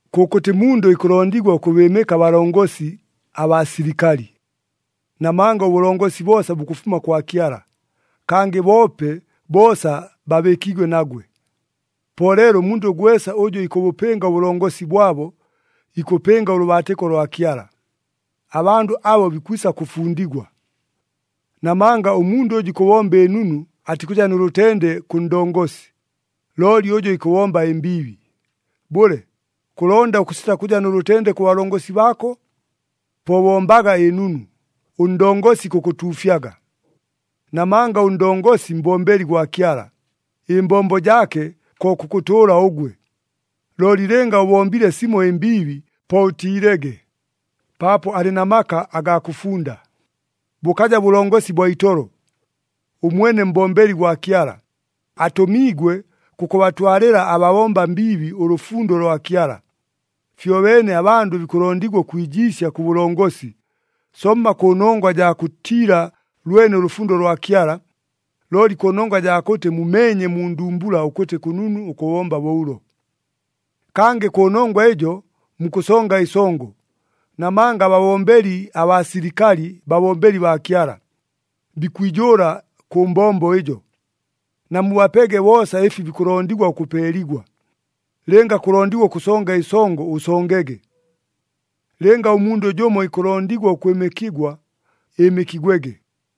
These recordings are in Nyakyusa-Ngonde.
Kʉkʉtɨ mundʉ ikʉlondigwa ʉkʉbɨɨmɨka abalongosi abaa silikali. Namanga ʉbʉlongosi boosa bukʉfuma kwa Kyala, kangɨ boope boosa babɨɨkiigwe nagwe. Po leelo ʉmundʉ gwesa ʉjʉ ikʉbʉpɨnga ʉbʉlongosi bwabo, ikʉpɨnga ʉlʉbaatɨko lwa Kyala. Abandʉ abo bikwisa kʉfundigwa. Namanga ʉmundʉ ʉjʉ ikʉbomba ɨnunu atikʉja nʉ lʉtende kʉ ndongosi, looli ʉjʉ ikʉbomba ɨmbiibi. Bʉle, kʉlonda ʉkʉsita kʉja nʉ lʉtende kʉ balongosi baako? Po bombaga ɨnunu, ʉndongosi ikʉkʉtuufyaga. Namanga ʉndongosi mbombeli gwa Kyala, ɨmbombo jaake ko kʉkʉtʉʉla ʉgwe. Looli lɨnga ʉbombile simo ɨmbiibi, po ʉtiilege! Paapo alɨ na maka agaa kʉfunda, bʉkaja bʉlongosi bwa itolo! Ʉmwene mbombeli gwa Kyala, atʉmiigwe kʉkʉbatwalɨla ababomba mbiibi ʉlʉfundo lwa Kyala. Fyobeene abandʉ bikʉlondigwa ʉkwijiisya kʉ balongosi, somma kʉnongwa jaa kʉtiila lwene ʉlʉfundo lwa Kyala, looli kʉnongwa jaa kʉtɨ mumeenye mu ndumbula ʉkʉtɨ kʉnunu ʉkʉbomba bo ʉlo. Kangɨ kʉnongwa ɨjo mukʉsonga ɨsongo. Namanga ababombeli abaa silikali babombeli baa Kyala. Bikwijʉʉla kʉ mbombo ɨjo. Namubapege boosa ɨfi bikʉlondigwa ʉkʉpeeligwa. Lɨnga kʉlondigwa ʉkʉsonga ɨsongo, ʉsongege. Lɨnga ʉmundʉ jʉmo ikʉlondigwa ʉkwɨmɨkigwa, ɨɨmɨkigwege.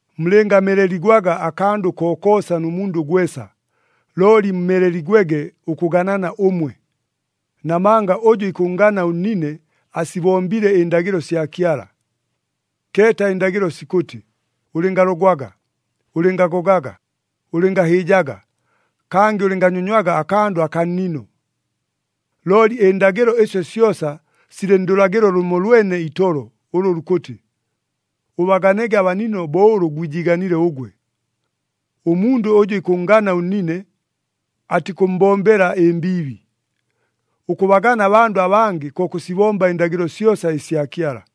Mulɨngameleligwaga akandʉ kokoosa nʉ mundʉ gwesa, looli mumeleligwege ʉkʉganana ʉmwe. Namanga ʉjʉ ikʉnngana ʉnnine, asibombile ɨndagɨlo sya Kyala. Keeta ɨndagɨlo sikʉtɨ, “Ʉlɨngalogwaga, ʉlɨngagogaga, ʉlɨngahɨɨjaga, kangɨ ʉlɨnganyonywaga akandʉ akaa nnino.” Looli ɨndagɨlo ɨsyo syosa silɨ ndʉlagɨlo lʉmolwene itolo ʉlʉ lukʉtɨ, “Ʉbaganege abanino bo ʉlʉ gwijiiganile ʉgwe.” Ʉmundʉ ʉjʉ ikʉnngana ʉnnine, atikʉmmbombela ɨmbiibi. Ʉkʉbagana abandʉ abangɨ ko kʉsibomba ɨndagɨlo syosa ɨsya Kyala.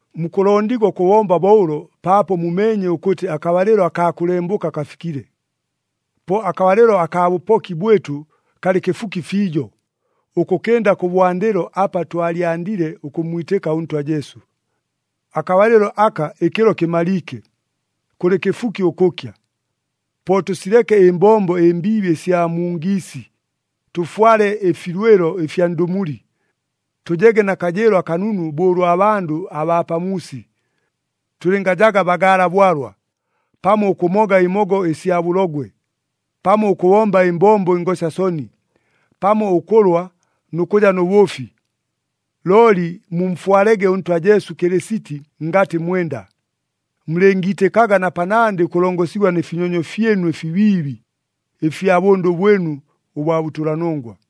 Mukʉlondigwa ʉkʉbomba bo ʉlo paapo mumeenye ʉkʉtɨ akabalɨlo akaa kʉlembʉka kafikile. Po akabalɨlo akaa bʉpoki bwɨtʉ kalɨ kɨfuki fiijo, ʉkʉkɨnda kʉbwandɨlo apa twalyandile ʉkʉmmwitɨka ʉNtwa Jesu. Akabalɨlo aka ɨkɨlo kɨmaliike, kʉlɨ kɨfuki ʉkʉkya. Po tʉsileke ɨmbombo ɨmbiibi ɨsya mu ngiisi, tʉfwale ɨfilwɨlo ɨfya ndʉmuli. Tʉjege na kajɨɨlo akanunu bo ʉlwa bandʉ abaa pamuusi. Tʉlɨngajaga bagaala bwalwa, pamo ʉkʉmoga ɨmogo ɨsya bʉlogwe, pamo ʉkʉbomba ɨmbombo ɨngosya soni, pamo ʉkʉlwa nʉ kʉja nʉ bʉʉfi. Looli mumfwalege ʉNtwa Jesu Kɨlɨsiti ngatɨ mwenda. Mulɨngiitɨkaga na panandɨ ʉkʉlongosigwa nɨ finyonyo fyɨnu ɨfibiibi ɨfya bʉndʉ bwɨnu ʉbwa bʉtʉlanongwa.